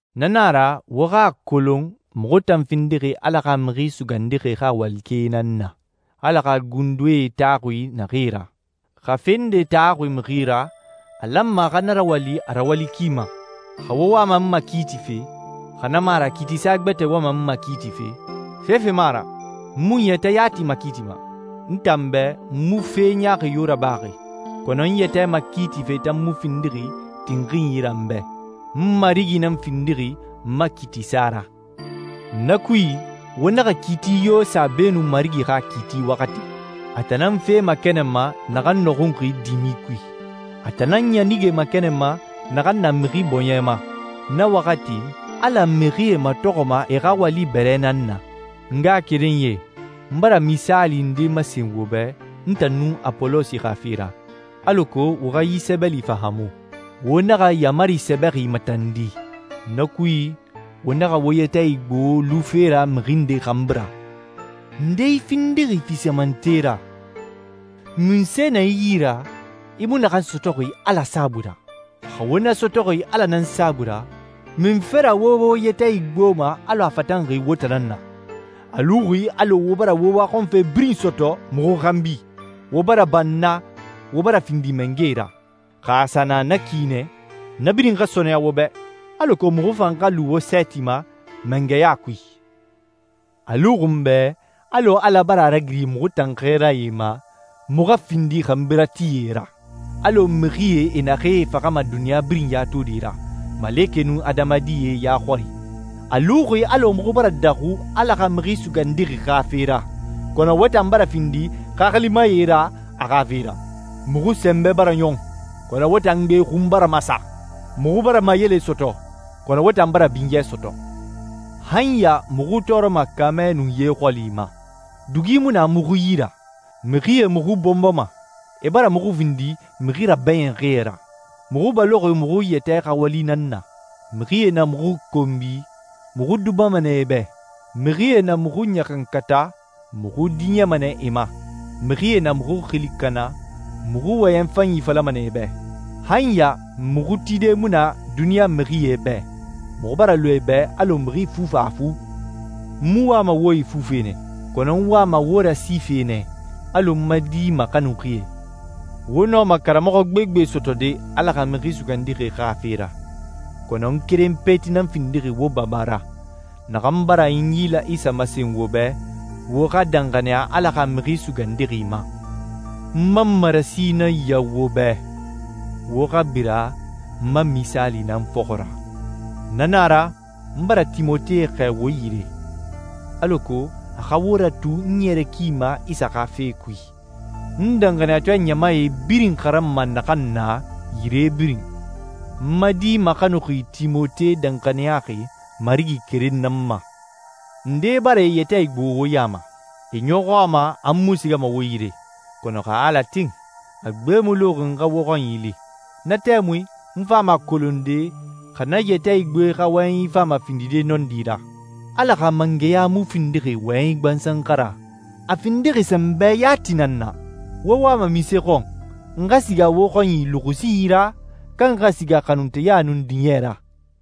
Na na a ra, wo xa a kolon muxu tan findixi Ala xa Mixi Sugandixi xa walikɛe nan na, Ala xa gundoe taxuxi naxee ra. Xa fe nde taxuxi mixi ra, a lanma a xa na rawali a rawali ki ma. Xa wo wama n makiitife, xa na mu a ra kiitisa gbɛtɛ wama n makiitife, fefe mu a ra. N mu n yɛtɛ yati makiitima. N tan bɛ, n mu fe ɲaaxi yo rabaxi, kɔnɔ n yɛtɛ makiitife tan mu findixi tinxinyi ra n bɛ. N Marigi nan findixi n ma kiitisa ra. Na kui, wo naxa kiiti yo sa beenun Marigi xa kiiti waxati. A tan nan fe makɛnɛnma naxan nɔxunxi dimi kui. A tan nan ɲanige makɛnɛnma naxan na mixi bɔɲɛ ma. Na waxati, Ala mixie matɔxɔma e xa wali bɛrɛ nan na. N ngaxakerenyie, n bara misaali nde masen wo bɛ n tan nun Apolosi xa fe ra, alako wo xa yi sɛbɛli fahaamu, «Wo naxa yaamari sɛbɛxi matandi.» Na kui, wo naxa wo yɛtɛ igbo lufe ra mixi nde xanbi ra. Nde i findixi fisamante ra? Munse na i yi ra, i mu naxan sɔtɔxi Ala saabui ra? Xa wo na sɔtɔxi Ala nan saabui ra, munfe ra wo wo yɛtɛ igboma alɔ a fatanxi wo tan nan na? A luxi alɔ wo bara wo waxɔnfe birin sɔtɔ muxu xanbi, wo bara banna, wo bara findi mangɛe ra. Xa a sa na na ki nɛ, na birin xa sɔɔnɛya wo bɛ, alako muxu fan xa lu wo sɛɛti ma mangɛya kui. A luxi n bɛ alɔ Ala bara a ragiri muxu tan xɛɛrae ma, muxu xa findi xanbiratie ra, alɔ mixie e naxee faxama duniɲa birin ya tode ra, malekɛe nun adamadie ya xɔri. A luxi alɔ muxu bara daxu Ala xa Mixi Sugandixi xa fe ra, kɔnɔ wo tan bara findi xaxilimae ra a xa fe ra. Muxu sɛnbɛ bara ɲɔn, kɔnɔ wo tan gbe xun bara masa. Muxu bara mayele sɔtɔ, kɔnɔ wo tan bara binyɛ sɔtɔ. Han ya muxu tɔɔrɔma kaamɛ nun ye xɔli ma. Dugi mu na muxu yi ra. Mixie muxu bɔnbɔma, e bara muxu findi mixi rabɛɲinxie ra. Muxu baloxi muxu yɛtɛ xa wali nan na. Mixie na muxu konbi, muxu dubama nɛ e bɛ. Mixie na muxu ɲaxankata, muxu diɲɛma nɛ e ma. Mixie na muxu xili kana, muxu wɔyɛn fanyi falama nɛ e bɛ. Han ya muxu tide mu na duniɲa mixie bɛ, muxu bara lu e bɛ alɔ mixi fufafu. N mu wama wo ifufe nɛ, kɔnɔ n wama wo rasife nɛ alɔ n ma di maxanuxie. Wo nɔma karamɔxɔ gbegbe sɔtɔde Ala xa Mixi Sugandixi xa fe ra, kɔnɔ n keren peti nan findixi wo baba ra, naxan bara Inyila Isa masen wo bɛ, wo xa danxaniya Ala xa Mixi Sugandixi ma. N ma marasi nan ya wo bɛ: Wo xa bira n ma misaali nan fɔxɔ ra. Na na a ra, n bara Timote xɛɛ wo yire, alako a xa wo ratu n naɲɛrɛ ki ma Isa xa fe kui, n danxaniyatɔɛ ɲamae birin xaranma naxan na yire birin. N ma di maxanuxi Timote danxaniyaxi Marigi keren nan ma. Ndee bara e yɛtɛ igbo wo ya ma. E ɲɔxɔ a ma n mu sigama wo yire, kɔnɔ, xa Ala tin, a gbe mu luxi n xa wo xɔnyi li. Na tɛmui n fama a kolonde xa na yɛtɛ igboe xa wɔyɛnyi fama findide nɔndi ra. Ala xa mangɛya mu findixi wɔyɛnyi gbansan xa ra, a findixi sɛnbɛ yati nan na. Wo wama munse xɔn? N xa siga wo xɔnyi luxusinyi ra, ka n xa siga xanunteya nun diɲɛ ra?